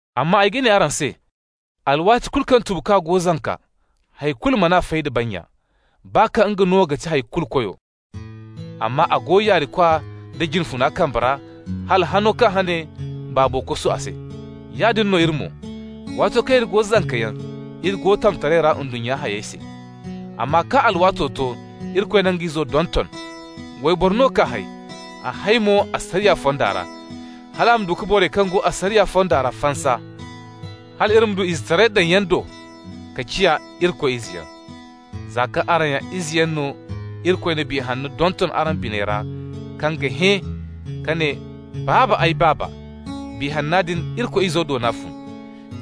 Amma ay ga ne araŋ se: alwaati kulu kaŋ tubukwa go zanka, hay kulu man'a fay da bannya, baa kaŋ nga no ga ti hay kulu koyo. Amma a go yaarikwa da jine funa kambe ra hala hano kaŋ hane baabo kosu a se. Yaadin no iri mo. Waato kaŋ iri go zankayaŋ, iri go tamtaray ra ndunnya hayey se. Amma kaŋ alwaato to, Irikoy na nga Izo donton. Wayboro no k'a hay. A hay mo asariya fonda ra, hal a ma du ka borey kaŋ go asariya fonda ra fansa, hal iri ma du izetaray daŋyaŋ do ka ciya Irikoy izeyaŋ. Za kaŋ araŋ ya izeyaŋ no, Irikoy na Biya Hanno donton araŋ biney ra kaŋ ga hẽ ka ne: «Baaba, ay Baaba!» Biya Hanna din, Irikoy Izo do no a fun.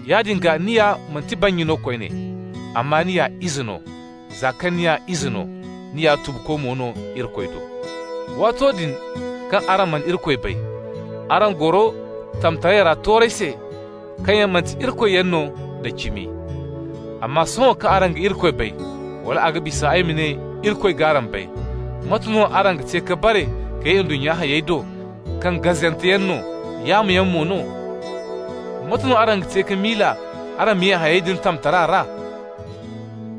Yaadin gaa ni ya manti bannya no koyne, amma ni ya ize no. Za kaŋ ni ya ize no, ni ya tubuko mo no Irikoy do. Waato din kaŋ araŋ mana Irikoy bay, araŋ goro tamtaray ra toorey se kaŋ yaŋ manti irikoyyaŋ no da cimi. Amma sohõ kaŋ araŋ ga Irikoy bay, wala a ga bisa ay ma ne Irikoy g'araŋ bay, mate no araŋ ga te ka bare ka ye ndunnya hayey do kaŋ gazanteyaŋ no, yaamoyaŋ mo no? Mate no araŋ ga te ka miila araŋ ma ye hayey din tamtara ra?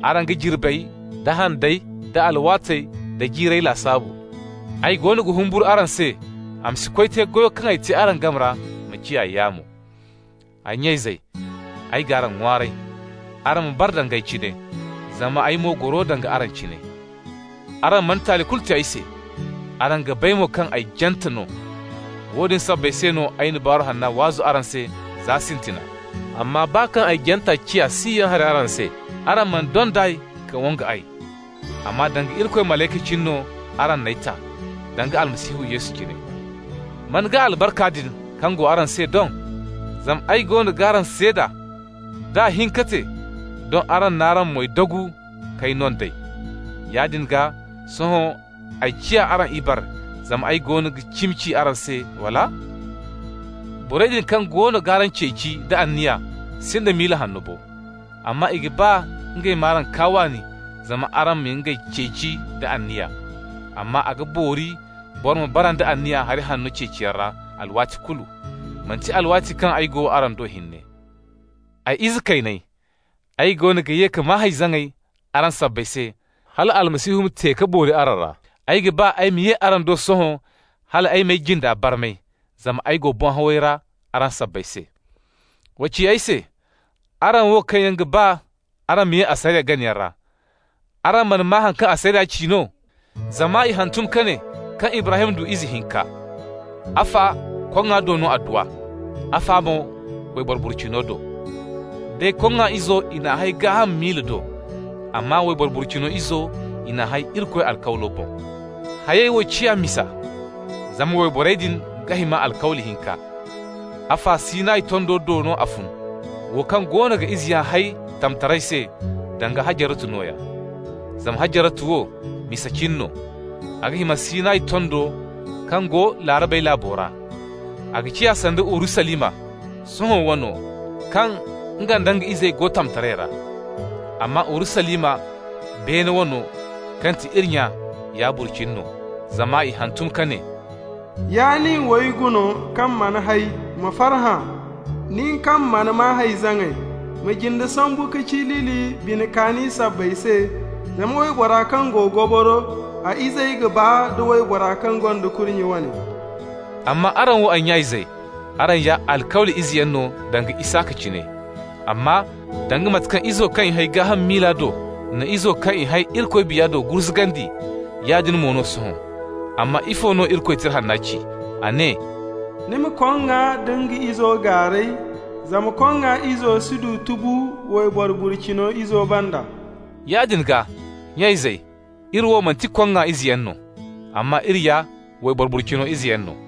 Araŋ ga jirbey, da handey, da alwaatey, da jiirey lasaabu! Ay goono ga humburu araŋ se a ma si koy te goyo kaŋ ay te araŋ game ra ma ciya yaamo! Ay nya-izey, ay g'araŋ ŋwaaray, araŋ ma bara danga ay cine, zama ay mo goro danga araŋ cine. Araŋ mana taali kulu te ay se. Araŋ ga bay mo kaŋ ay jante no. Woodin sabbay se no ay na Baaru Hanna waazu araŋ se za sintina. Amma baa kaŋ ay janta ciya siyaŋ hari araŋ se, araŋ mana dond'ay ka wangu ay. Amma danga Irikoy malayka cine no araŋ n'ay ta, danga Almasihu Yesu cine. Man gaa albarka din kaŋ go araŋ se doŋ? Zama ay goono g'araŋ seeda, d'a hin ka te, doŋ araŋ n'araŋ moy dagu k'ay no nd'ey. Yaadin gaa, sohõ ay ciya araŋ ibare zama ay goono ga cimi ci araŋ se, wala? Borey din kaŋ goono g'araŋ ceeci nda anniya sinda miila hanno bo. Amma i ga ba ngey m'araŋ kaa waani zama araŋ ma ngey ceeci nda anniya. Amma a ga boori boro ma bara nda anniya hari hanno ceeciyaŋ ra alwaati kulu, manti alwaati kaŋ ay go araŋ do hinne. Ay ize kayney, ay goono ga ye ka maa hay-zaŋay araŋ sabbay se hal Almasihu ma te ka boori araŋ ra! Ay ga ba ay ma ye araŋ do sohõ hal ay m'ay jinda barmay, zama ay go boŋ-haway ra araŋ sabbay se. Wa ci ay se, araŋ wo kaŋ yaŋ ga ba araŋ ma ye asariya ganayaŋ ra: araŋ mana maa haŋ kaŋ asariya ci no? Zama i hantum ka ne kaŋ Ibrahim du ize hinka. Afa koŋŋa do no a du a, afa mo wayboro burcino do. Day koŋŋa izo, i n'a hay gaaham miila do, amma wayboro burcino izo, i n'a hay Irikoy alkawlo boŋ. Hayey wo ciya misa, zama wayborey din ga hima alkawli hinka. Afa, Sinayi tondo do no a fun, wo kaŋ goono ga izeyaŋ hay tamtaray se, danga Hajaratu nooya. Zama Hajaratu wo, misa cine, a ga hima Sinayi tondo kaŋ go Laarabey laabo ra. A ga ciya sanda Urusalima, sohõ wano, kaŋ nga nda nga izey go tamtaray ra. Amma Urusalima, beene wano, kaŋ ga ti iri nya, ya burcini no. Zama i hantum ka ne: «Ya nin wayguno kaŋ mana hay, ma farhã! Nin kaŋ mana maa hay-zaŋay, ma jinde sambu ka cilili bine kaani sabbay se, zama waybora kaŋ go goboro, a izey ga baa da waybora kaŋ gonda kurnye wane.» Amma araŋ wo, ay nya-izey, araŋ ya alkawli izeyaŋ no danga Isaka cine. Amma danga mate kaŋ izo kaŋ i hay gaaham miila do na izo kaŋ i hay Irikoy Biya do gurzugandi, yaadin mo no sohõ. Amma ifo no Irikoy Tira Hanna ci? A ne: «Ni ma koŋŋa da nga izo gaaray, zama koŋŋa izo si du tubu wayboro burcino izo banda.» Yaadin gaa, nya-izey, iri wo manti koŋŋa izeyaŋ no, amma iri ya wayboro burcino izeyaŋ no.